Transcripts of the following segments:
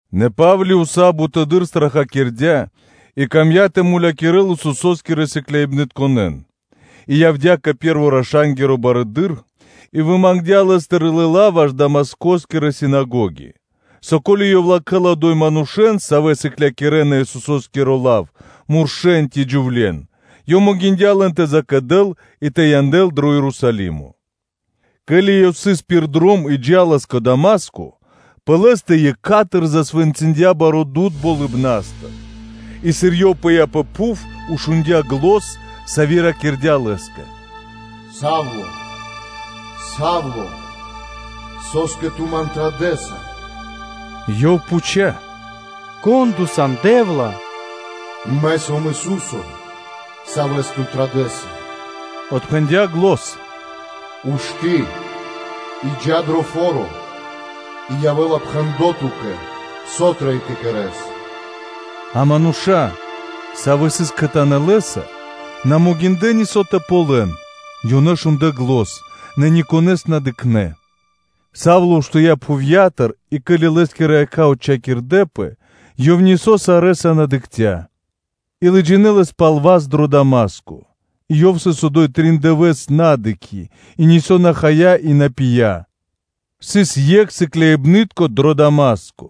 Нэ Па́вли уса́ бутэды́р страхакирдя и камдя́ тэ мулякирэ́л Исусо́скирэ сыкляибнытконэ́н и явдя́ кэ пэ́рво раша́нгиро барыдыро́. И вымангдя лэ́стыр лыла́ ваш Дамаскоскирэ синагоги, со ко́ли ёв латхэ́ла одо́й манушэ́н, савэ́ сыклякирэ́на Исусо́скиро лав, муршэ́н ци джувле́н, ёв могиндя́ лэн тэ закэдэл и тэ янэл дро Ерусалимо. Ке́ли ёв сыс пир дром и джа́лас кэ Дама́ско, пэ лэ́стэ екха́тыр (сра́зу) засвэнцындя баро́ дуд (свэ́то) болыбна́стыр, и, сыр ёв пыя́ пэ пхув, шундя́ зан, сави́ ракирдя́ лэ́скэ: “Са́вле, Са́вле! Со́скэ ту Ман традэса?” Ёв пхуця́: “Кон Ту сан, Раё Дэ́вла?” “Мэ сом Ису́со, Савэс ту традэса”, – отпхэндя́ зан, “Ушты́ и джа́ дро фо́ро, и явэ́ла пхэндло́ ту́кэ, со трэй тэ кэрэ́с.” А мануша́, савэ́ сыс кхэтанэ́ лэ́са, на могиндлэ́ нисо́ тэ ґалён; ёнэ шундлэ́ зан, нэ никонэ́с на дыкхнэ́. Савло уштыя́ пхувья́тыр и, ке́ли лэ́скирэ якха́ отчхакирдэпэ, ёв нисо́ сарэ́са на дыкхця́; и лыджинэ́ лэс пал васт дро Дама́ско. И ёв сыс одо́й трин дывэса́ на дыкхи́; и нисо́ на хая, и на пия Сыс екх сыкляибны́тко дро Дама́ско,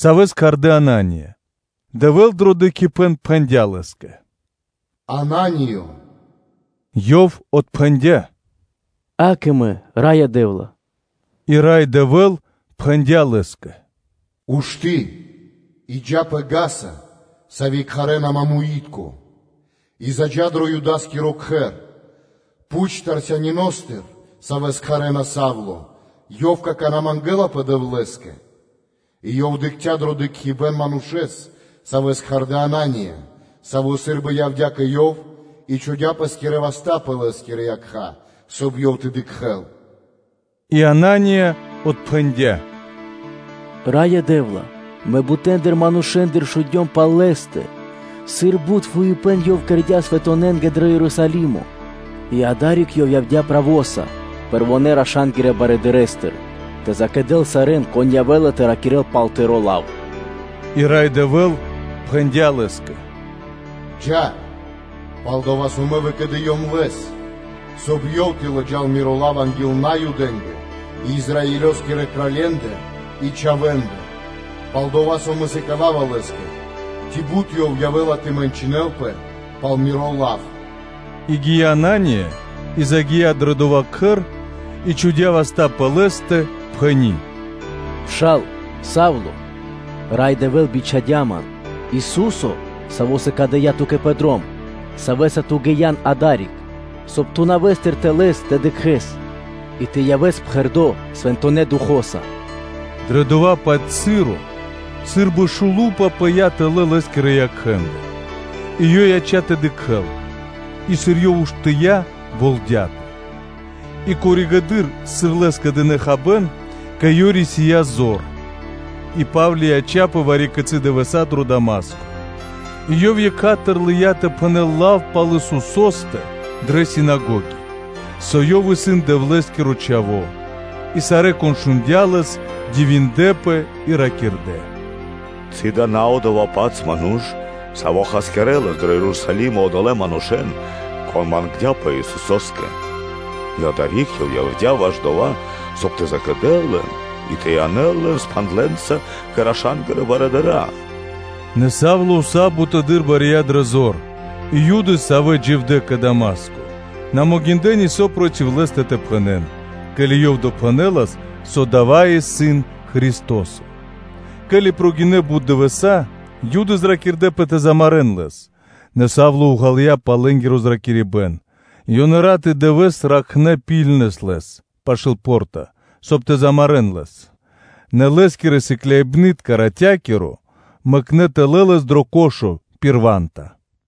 савэ́с кхардэ́ Анания. Дэвэ́л дро дыкхибэ́н пхэндя́ лэ́скэ: “Анание! Ёв отпхэндя́: “Ѓа́да, мэ сом Раё Дэ́вла.” И Рай Дэвэ́л пхэндя́ лэ́скэ: “Ушты́ и джа́ пэ вули́ца (га́са), сави́ кхарэ́на “Мамуи́тко (Пря́мо)” и заджа́ дро Юда́скиро кхэр, пхуч Тарсяниностыр, савэ́с кхарэ́на “Савло”; ёв какана́ мангэлапэ Дэвлэ́скэ, и ёв дыкхця́ дро дыкхибэ́н манушэ́с, савэ́с кхардэ́ “Анания”, саво́ сы́рбы явдя́ кэ ёв и чхудя́ пэ́скирэ васта́ пэ лэ́скирэ якха́, соб (кай) ёв тэ дыкхэ́л. И Анания отпхэндя́: “Раё Дэ́вла! Мэ бутэндыр манушэ́ндыр шундём пал лэ́стэ, сыр бут фуипэ́н ёв кэрдя́ свэнтонэнгэ дро Ерусалимо; и адари́к ёв явдя́ правоса пэрвонэ́-раша́нгирэ барыдырэстыр тэ закэдэл сарэ́н, кон явэ́ла тэ ракирэ́л пал Тыро́ лав. И Рай Дэвэ́л пхэндя́ лэ́скэ: “Джа́, пал-дова́ со Мэ выкэдыём лэс, соб (кай) ёв тэ лыджа́л Миро лав анги́л манушэ́ндэ Наюдэ́ндэ, и Израилёскирэ кралье́ндэ чхавэ́ндэ: пал-дова́ со Мэ сыкава́ва лэ́скэ, ци бут ёв явэ́ла тэ мэнчынэлпэ пал Миро лав.” И гия́ Анания и загия́ дро дова́ кхэр, и чхудя́ васта́ пэ лэ́стэ, пхэни́: “Пша́ла, Са́вле! Рай Дэвэ́л Ису́со бичхадя́ ман, Саво́ сыкадыя́ ту́кэ пэ дром, Савэ́са ту ги́ян адари́к, соб (кай) ту нэвэ́стыр тэ лэс тэ дыкхэ́с и тэ явэс пхэрдо́ Свэнтонэ́ Духо́са.” Дрэ дова́-паць часо, сы́рбы шулупа пыя́ тэлэ́ лэ́скирэ якхэ́ндыр, и ёв яця́ тэ дыкхэ́л: и, сыр ёв уштыя́, болдяпэ; и коригэды́р (позжэды́р), сыр лэ́скэ дынэ́ хабэ́н, кэ ёв рисия́ зор. И Па́вли яця́пэ вари-кицы́ дывэса́ дро Дама́ско. И ёв екха́тыр лыя́ тэ пхэнэ́л лав пал Исусо́стэ дрэ синагоги, со Ёв исын Дэвлэ́скиро Чхаво́. И сарэ́, кон шундя́ лэс, дивиндлэ́пэ и ракирдэ́: “Ци дава́ исын на одова́-паць ману́ш, саво́ хасякирэлас дро Ерусалимо одолэ́ манушэ́н, кон мангдя́пэ Исусо́скэ, и адари́к ёв явдя́ ваш дова́, соб (кай) тэ закэдэл лэн и тэ янэл лэн спхандлэнца кэ раша́нгирэ барыдыра́?” Нэ Савло уса́ бутыдыр бария дрэ зор, и Юды, савэ́ дживдэ́ кэ Дама́ско, на могиндлэ́ нисо́ проти лэ́стэ тэ пхэнэ́н, ке́ли ёв допхэнэлас, со дава́ исын Христо́со. Ке́ли прогинэ́ (накхлэ) бут дывэса́, Юды зракирдэпэ тэ замарэ́н лэс. Нэ Савло уґалыя пал лэ́нгиро зракирибэ́н. Ёнэ рат и дывэ́с дыкхнэ́ ракхибны́ткэс лэс пашы́л по́рта, соб (кай) тэ замарэ́н лэс; нэ лэ́скирэ сыкляибны́тка ратя́киро мэкнэ́ тэлэ́ лэс дро кхудо (корзина) пир ва́нта.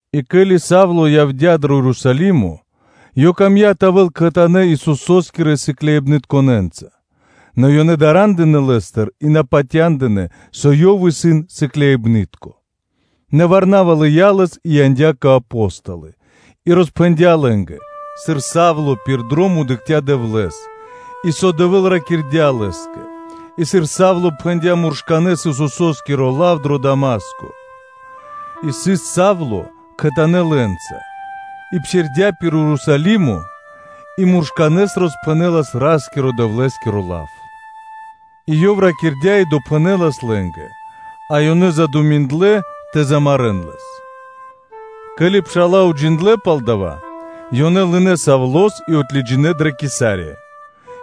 И ке́ли Савло явдя́ дро Ерусалимо, ёв камдя́ тэ явэ́л кхэтанэ́ Исусо́скирэ сыкляибнытконэ́нца; нэ ёнэ дара́ндынэ лэ́стыр, и на патяндынэ́, со ёв исын сыкляибны́тко. Нэ Варнава лыя́ лэс и яндя́ кэ Апо́столы и роспхэндя́ лэ́нгэ, сыр Савло пир дром дыкхця́ Рас-Дэвлэ́с, и со Рай Дэвэ́л ракирдя́ лэ́скэ, и сыр Савло пхэндя́ муршканэ́с Исусо́скиро лав дро Дама́ско. И сыс Савло кхэтанэ́ лэ́нца и псирдя́ пир Ерусалимо и муршканэ́с роспхэнэлас Ра́скирэ-Дэвлэ́скиро лав. И ёв ракирдя́ и допхэнэлас лэ́нгэ; а ёнэ дынэ́ годы́ пэскэ́ тэ замарэ́н лэс. Ке́ли пша́ла уджиндлэ́ пал дава́, ёнэ лынэ́ Савлос и отлыджинэ дрэ Кесария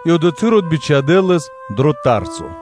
и одотхы́р отбичхадэ лэс дро Тарсо.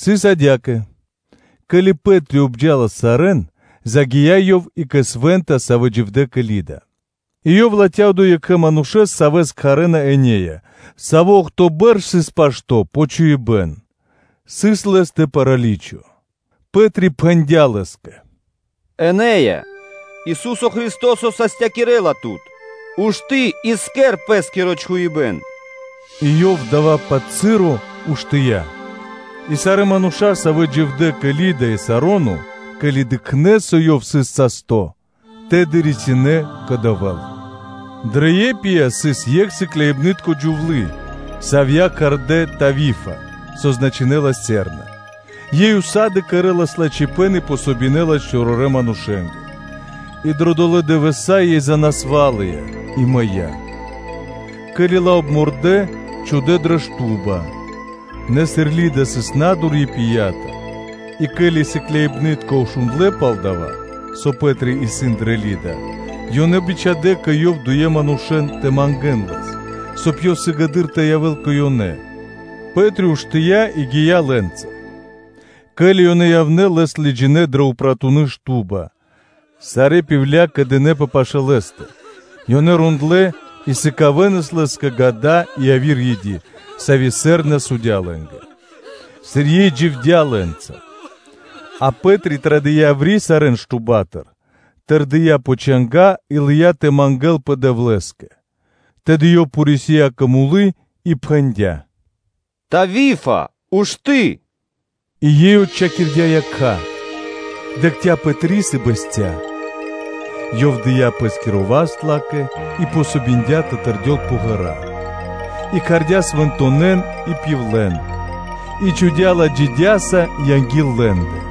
Сыс адя́кэ; ке́ли Пэ́три обджалас сарэ́н, загия́ ёв и кэ свэ́нта, савэ́ дживдэ́ кэ Лида. И ёв латхя́ одо́й екхэ манушэ́с, савэ́с кхарэ́на Энея, саво́ охто́ бэрш сыс пашто́ пэ чхуибэ́н; сыс лэ́стэ праличо. Пэ́три пхэндя́ лэ́скэ: “Энеё! Ису́со Христо́со састякирэла тут: ушты́ и кэр пэ́скиро чхуибэ́н” И ёв дава́-паць моменто уштыя́. И сарэ́ мануша́, савэ́ дживдэ́ кэ Лида и кэ Сароно, ке́ли ёнэ дыкхнэ́, со ёв сыс састо́, то и прилынэ́ ёнэ Рас-Дэвлэ́с Дрэ Иопия (Ёпия) сыс екх сыкляибны́тко джувлы́, савья́ кхардэ́ “Тавифа”, со значынэ́ла: “Серна.” Ёй усады (сак) кэрэ́лас лачхипэ́н и помогинэлас (дэ́лас васт) чорорэ́ манушэ́нгэ. И дро долэ́ дывэса́ ёй занасвалыя и мыя́; ке́ли ла обмордэ, чхудэ́ дрэ упратуны шту́ба. Нэ сыр Лида сыс на́дур Иопиятыр, и, ке́ли сыкляибны́тка шундлэ́ пал дова́, со Пэ́три исын дрэ Лида, ёнэ бичхадя́ кэ ёв дуе манушэ́н тэ мангэ́н лэс, соб (кай) ёв сыгэды́р тэ явэ́л кэ ёнэ. Пэ́три уштыя́ и гия́ лэ́нца. Ке́ли ёнэ явнэ́, лэс лыджинэ́ дрэ упратуны шту́ба; сарэ́ пивля (удовы) кэдынэпэ пашы́л лэ́стэ, ёнэ рондлэ́ и сыкавэнас лэ́скэ гада и яви́р и́дя, сави́ “Серна” судя лэ́нгэ, сыр ёй дживдя́ лэ́нца. А Пэ́три традыя́ яври́ сарэ́н штубатыр, тэрдия́ пэ чанга́ и лыя́ тэ мангэ́лпэ Дэвлэ́скэ; тэды ёв порисия кэ мулы и пхэндя́: “Тавифие, ушты́!” И ёй отчхакирдя́ якха́, дыкхця́ Пэтрис и бэсця́. Ёв дыя́ пэ́скиро васт ла́кэ и помогиндя тэ тэрдёл пэ ґэра́ и кхардя́ свэнтонэн и пивлен (удовэн), и чхудя́ ла джидяса анги́л лэ́ндэ.